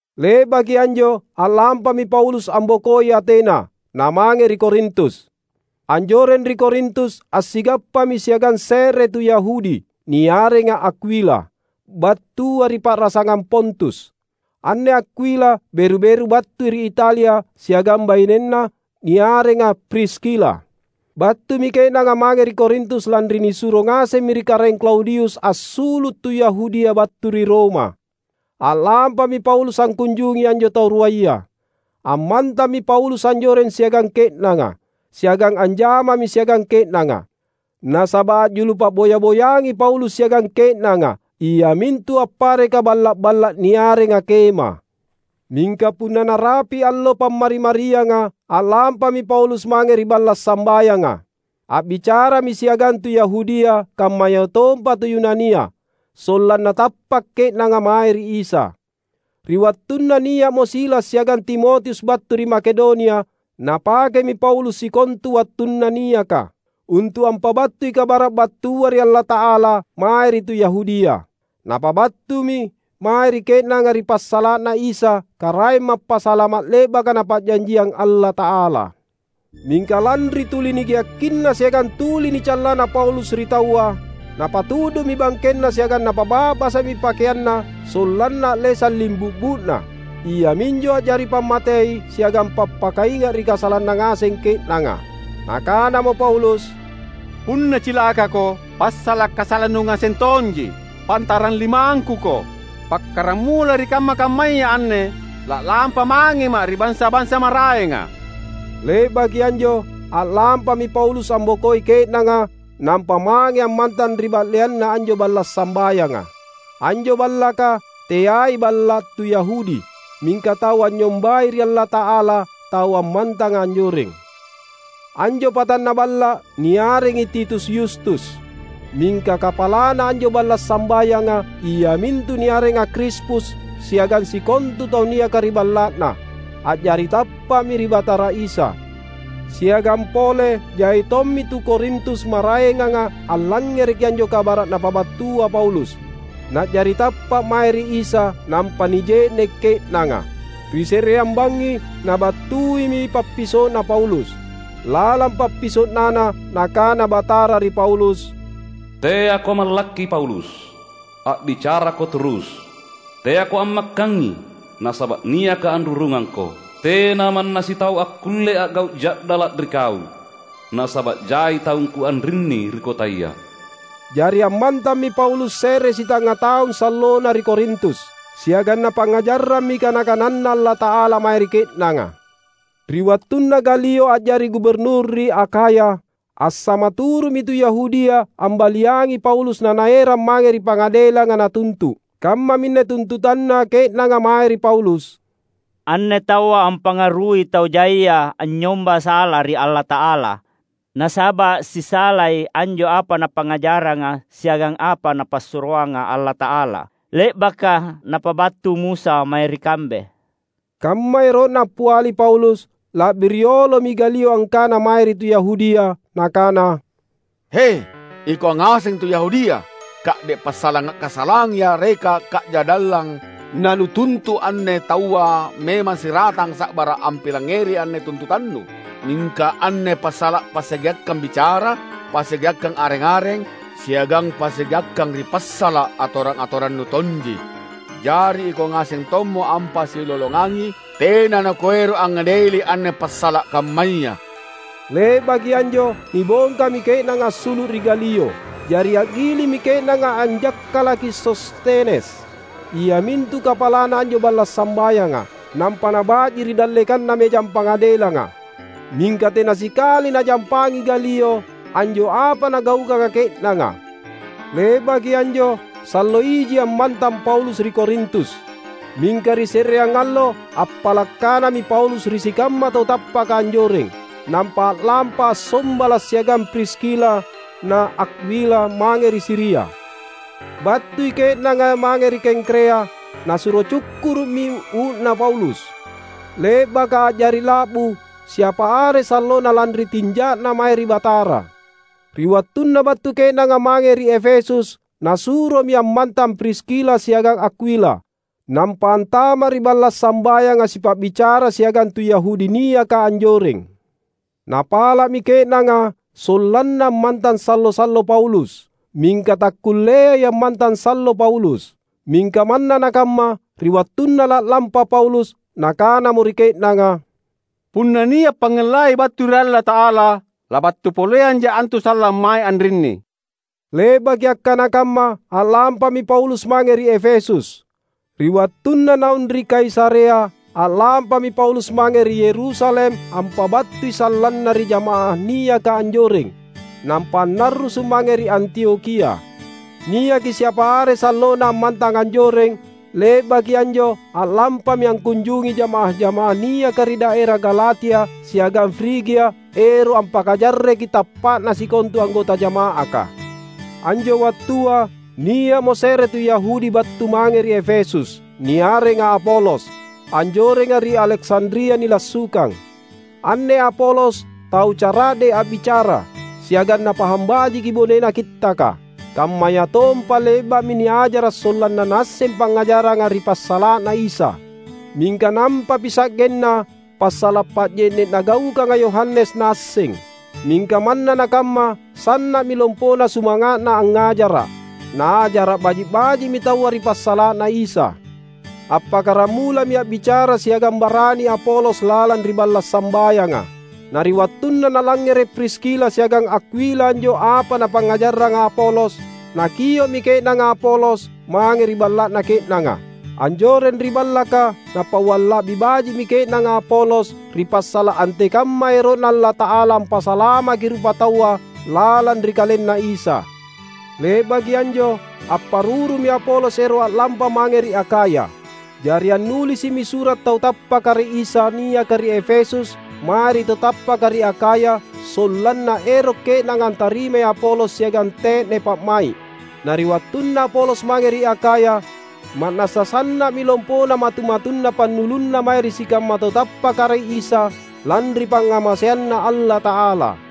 Le’baki anjo a’lampami Paulus ambokoi Atena, namange ri Korintus. Anjoreng ri Korintus assigappami siagang se’re tu Yahudi, niarenga Akwila, battua ri pa’rasangang Pontus. Anne Akwila beru-beru battui ri Italia siagang bainenna niarenga Priskila. Battumi ke’nanga mange ri Korintus lanri nisuro ngasemmi ri Karaeng Klaudius assulu’ tu Yahudia battu ri Roma. A’lampami Paulus angkunjungi anjo tau ruaya. Ammantammi Paulus anjoreng siagang ke’nanga, siagang anjamami siagang ke’nanga. Nasaba’ a’julu pa’boya-boyangi Paulus siagang ke’nanga, iamintu appareka balla’-balla’ niarenga kema. Mingka punna narapi’ allo Pammari-marianga, a’lampami Paulus mange ri balla’ sambayanga. A’bicarami siagang tu Yahudia kammayatompa tu Yunania, sollanna tappa’ ke’nanga mae ri Isa. Ri wattunna nia’mo Silas siagang Timotius battu ri Makedonia, napakemi Paulus sikontu wattunna niaka, untu’ ampabattui kabara’ battua ri Allata’ala mae ri tu Yahudia. Napabattumi mae ri ke’nanga ri passala’na Isa, Karaeng Mappasalama’ le’baka Napa’janjiang Allata’ala. Mingka lanri tuli nigeakkinna siagang tuli nicallana Paulus ri taua, napatu’du’mi bangkenna siagang napaba’basa’mi pakeanna sollanna a’lesang limbu’bu’na; iaminjo a’jari pammatei siagang pappakainga’ ri kasalanna ngaseng ke’nanga. Nakanamo Paulus, "Punna cilakako, passala’ kasalannu ngaseng tonji! Pantarang limangkuko! Pakkaramula ri kamma-kammaya anne la’lampa mangema’ ri bansa-bansa maraenga." Le’baki anjo, a’lampami Paulus ambokoi ke’nanga nampa mange ammantang ri ba’leanna anjo balla’ sambayanga. Anjo ballaka, teai balla’ tu Yahudi, mingka tau anynyombai ri Allata’ala tau ammantanga anjoreng. Anjo patanna balla’ niarengi Titus Yustus. Mingka kapalana anjo balla’ sambayanga, iamintu niarenga Krispus siagang sikontu tau niaka ri balla’na, a’jari tappa’mi ri Batara Isa. Siagang pole jai tommi tu Korintus maraenganga allangngereki anjo kabara’ napabattua Paulus, na’jari tappa’ mae ri Isa nampa nije’ne’ ke’nanga. Ri se’reang bangngi nabattuimi pappiso’na Paulus. Lalang pappiso’nana Nakana Batara ri Paulus, "Teako mallakki Paulus! A’bicarako turus, teako ammakkangi. Nasaba’ niaKa’ anrurungangko. Tena manna sitau akkulle a’gau’ ja’dala’ ri kau, nasaba’ jai taungKu anrinni ri kotaya." Jari ammantammi Paulus se’re sitangnga taung sallona ri Korintus, siagang napangngajarrammi kana-kananNa Allata’ala mae ri ke’nanga. Ri wattunna Galio a’jari Guburnur ri Akhaya, assamaturu’mi tu Yahudia ambaliangi Paulus nanaerang mange ri pangadelanga natuntu’. Kammaminne tuntutanna ke’nanga mae ri Paulus, "Anne taua ampangarui tau jaia anynyomba sala ri Allata’ala; nasaba’ sisalai anjo apa napangngajarranga siagang apa Napassuroanga Allata’ala le’baka napabattu Musa mae ri kambe!" Kamma ero’na appiali Paulus, la’bi riolomi Galio angkana mae ri tu Yahudia, nakana, "He, ikau ngaseng tu Yahudia! Ka’de’ passala’ kasalang yareka kaja’dallang nanutuntu’ anne taua memang siratanga’ sa’bara’ ampilangngeri anne tuntutannu. Mingka anne passala’ passigeakkang bicara, passigeakkang areng-areng, siagang passigeakkang ri passala’ atorang-atorannu tonji! Jari ikau ngaseng tommo ampasilolongangi. Tena nakuero’ angngadeli anne passala’ kammaya!" Le’baki anjo nibongkami ke’nanga assulu’ ri Galio. Jari a’gilimmi ke’nanga anjakkalaki Sostenes, iamintu kapalana anjo balla’ sambayanga, nampa naba’ji ri dallekanna mejang pangadelanga. Mingka tena sikali najampangi Galio anjo apa nagaukanga ke’nanga. Le’baki anjo sallo iji ammantang Paulus ri Korintus. Mingka ri se’reang allo appala’ kanami Paulus ri sikamma tau tappaka anjoreng, nampa a’lampa assombala’ siagang Priskila na Akwila mange ri Siria. Battui ke’nanga mange ri Kengkrea, nasuro cukkuru’mi uu’na Paulus, le’baka a’jari la’bu siapa are sallona lanri tinja’na mae ri Batara. Ri wattunna battu ke’nanga mange ri Efesus, nasuromi ammantang Priskila siagang Akwila, nampa antama’ ri balla’ sambayanga sipa’bicara siagang tu Yahudi niaka anjoreng. Napala’mi ke’nanga sollanna ammantang sallo-sallo Paulus, mingka takkulleai ammantang sallo Paulus. Mingka manna nakamma, ri wattunna la’lampa Paulus, nakanamo ri ke’nanga, "Punna nia’ pangngellai battu ri Allata’ala, labattu poleanja’ antu sallang mae anrinni." Le’baki akkana kamma, a’lampami Paulus mange ri Efesus. Ri wattunna naung ri Kaisarea, a’lampami Paulus mange ri Yerusalem ampabattui sallanna ri jamaah niaka anjoreng, nampa annarrusu’ mange ri Antiokhia. Niaki siapa are sallona ammantang anjoreng. Le’baki anjo a’lampami angkunjungi jamaah-jamaah niaka ri daera Galatia siagang Frigia ero’ ampakajarreki tappa’na sikontu anggota jama’aka. Anjo wattua, nia’mo se’re tu Yahudi battu mange ri Efesus, niarenga Apolos, anjorenga ri Aleksandria nilassukang. Anne Apolos tau cara’de’ a’bicara, siagang napahang bajiki bonena Kittaka, kammayatompa le’ba’mi niajara’ sollanna naasseng pangngajarranga ri passala’na Isa. Mingka nampami sa’genna passala’ pa’je’ne’ nagaukanga Yohanes naasseng. Mingka manna nakamma sanna’mi lompona sumanga’na angngajara’. Naajara’ baji’-baji’mi taua ri passala’na Isa. Appakkaramulami a’bicara siagang barani Apolos lalang ri balla’ sambayanga. Na ri wattunna nalangngere’ Priskila siagang Akwila anjo apa napangngajarranga Apolos, nakio’mi ke’nanga Apolos mange ri balla’na ke’nanga. Anjoreng ri ballaka napauang la’bi baji’mi ke’nanga Apolos ri passala’ antekamma ero’Na Allata’ala ampasalamaki rupataua lalang ri KalenNa Isa. Le’baki anjo apparurumi Apolos ero’ a’lampa mange ri Akhaya. Jari annulisi’mi sura’ tau tappaka ri Isa niaka ri Efesus mae ri tau tappaka ri Akhaya sollanna ero’ ke’nanga antarimai Apolos siagang te’ne pa’mai’. Na ri wattunna Apolos mange ri Akhaya, ma’nassa sanna’mi lompona matu-matunna pannulunna mae ri sikamma tau tappaka ri Isa lanri pangngamaseanNa Allata’ala.